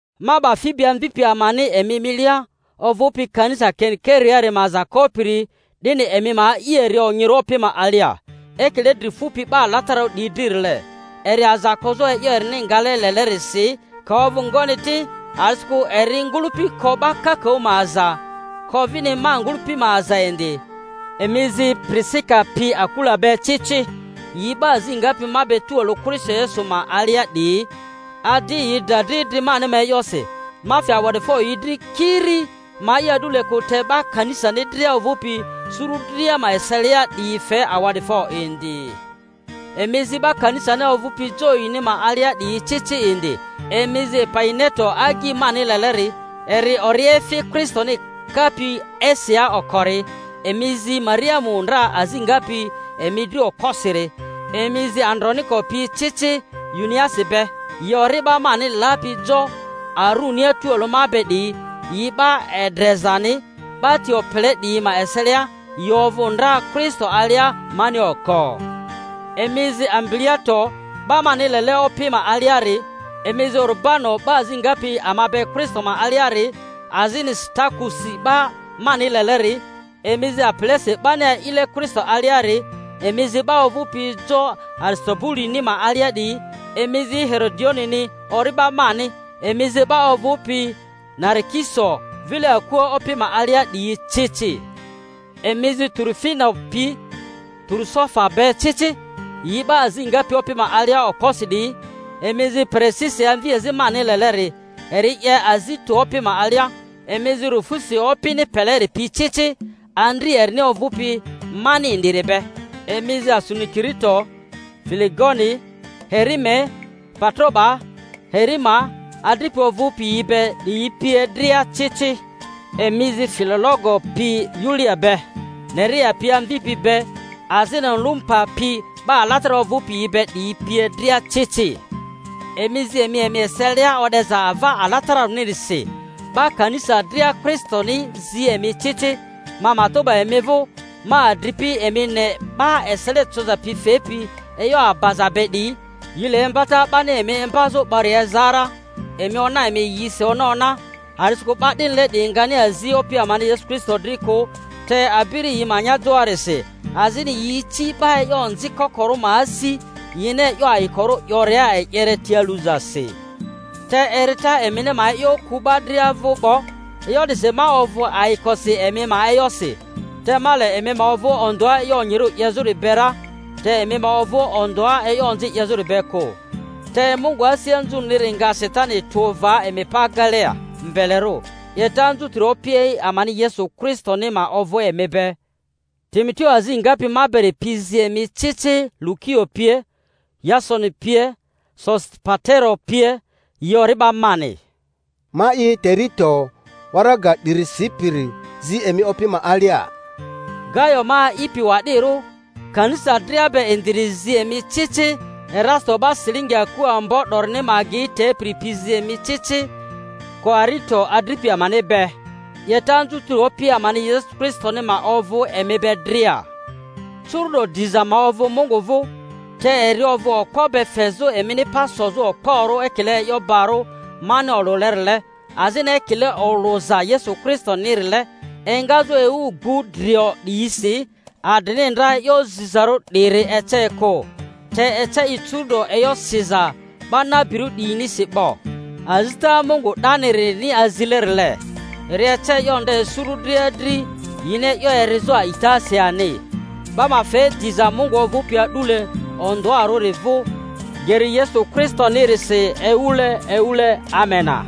Ma 'ba Fibi amvipi amani emi milia, ovᴜpi kanisa Keniki-reari ma aza kopiri, 'dini emi ma a'i eri onyirᴜ Opi ma alia, ekile dri fupi 'ba alatararu 'diyi dririle, eri aza kozᴜ e'yo erini ngale lelerisi, ka ovᴜ ngoni ti, a'disikᴜ eri ngᴜlᴜpi ko 'ba kakaᴜ ma aza, ko vini ma ngᴜlᴜpi ma aza indi. Emi zi Pirisika pi Akula be ci ci, yi 'ba azi ngapi ma be tualᴜ Kristo Yesu ma alia 'diyi, adi yi dra dri idri mani ma e'yosi, ma fe awa'difo yi dri, kiri ma'i a'dule kᴜ te 'ba kanisani dria ovᴜpi suru dria ma eselia 'diyi fe awa'difo indi; emi zi 'ba kanisani ovᴜpi jo yini ma alia 'diyi ci ci indi. Emi zi Epaineto agyi mani leleri, eri oriefi Kristoni kapi Asiaa okori. Emi zi Mariamu ndra azi ngapi emi dri okposiri. Emi zi Androniko pi ci ci Yuniasi be, yi ori'ba mani lapi jo arunia tualᴜ ma be 'diyi; yi 'ba endrezani 'ba ti opele 'diyi ma eselia, yi ovᴜ ndra Kristo alia mani oko. Emi zi Ampiliato 'ba mani lele Opi ma aliari. Emi zi Urubano, 'ba azi ngapi ama be Kristo ma aliari, azini Sitakusi 'ba mani leleri. Emi zi Apelesi 'bani a'ile Kristo aliari. Emi zi 'ba ovᴜpi jo Aristobuluni ma alia 'diyi. Emi zi Herodionini ori'ba mani. Emi zi 'ba ovᴜpi Narikiso vile akua Opi ma alia 'diyi ci ci. Emi zi Turufena pi Turufosa be ci ci, yi 'ba azi ngapi Opi ma alia okposi 'diyi. Emi zi Perisisi amviazi mani leleri, eri 'ye azi tᴜ Opi ma alia. Emi zi Rufusi Opini peleri pi ei ci, andri erini ovᴜpi mani indiri be. Emi zi Asunikirito, Filegoni, Herime, Patroba, Herima, adripi ovᴜpi yi be 'diyi pie dria ci ci. Emi zi Filologo pi Yulia be, Nerea pi amvi be, azini Olumpa pi, 'ba alatararᴜ ovᴜpi yi be 'diyi pie dria ci ci. Emi zi emi emi eselia o'deza ava alatararᴜnisi. 'Ba kanisa dria Kristoni yi zi emi ci ci. Ma matᴜ 'ba emi vᴜ, ma adri-pi, emi ne 'ba esele coza pi fepi e'yo abaza be 'diyi. Yi le imbata 'bani emi imbazᴜ 'bori eza ra; emi ona emi yisi ona ona. A'disikᴜ 'ba 'dinile 'diyi ngani azi Opi amani Kristo dri kᴜ, te abiri yi ma anyajoarisi, azini yi ici 'ba e'yo onzi kokorᴜ ma asi yini e'yo ayikorᴜ 'yoria e'yere ti aluzasi. Te erita emini ma e'yo ku 'ba dria vᴜ 'bo, e'yo 'disi ma ovᴜ ayikosi emi ma e'yosi, te ma le emi ma ovᴜ ondᴜa e'yo onyirᴜ 'yezᴜri be ra, te emi ma ovᴜ ondᴜa e'yo onzi 'yezᴜri be kᴜ; te Mungu asi anzurᴜniri nga Satani tᴜ va emi pa agelia mbelerᴜ. 'Yeta anzutiri Opi amani Yesu Kristoni ma ovᴜ emi be. Timoteo azi ngapi ma beri pi zi emi ci ci, Lukio pie, Yasoni pie, Sosipatero pie, yi ori'ba mani. Ma'i Teritio, waraga 'diri sipiri, zi emi Opi ma alia. Gayo ma a'ipi wa'dirᴜ, kanisa dria be indiri, zi emi ci ci. Erasito 'ba silingi aku ambo 'dorini ma agea tepiri pi zi emi ci ci Koarito adripi amani be. 'Yeta anzutiri Opi amani Yesu Kristoni ma ovᴜ emi be dria. Curu'do diza ma ovᴜ Mungu vᴜ, te eri ovᴜ okpo be fezᴜ emini pa sozᴜ okporᴜ ekile e'yo bari mani olᴜlerile azini ekile olᴜza Yesu Kristonirile. Engazᴜ ewu gbu drio 'diyisi, adrini ndra e'yo zizarᴜ 'diri ece kᴜ, te ece i curu'do e'yo siza 'ba nabirᴜ 'diyinisi 'bo, azita Mungu 'danirini azilerile. Eri ece e'yo nde suru dria dri yini e'yo erizᴜ a'itasi ani. 'Ba ma fe diza Mungu ovᴜpi a'dule ondᴜarᴜri vᴜ geri Yesu Kristonirisi ewule ewule! Amena.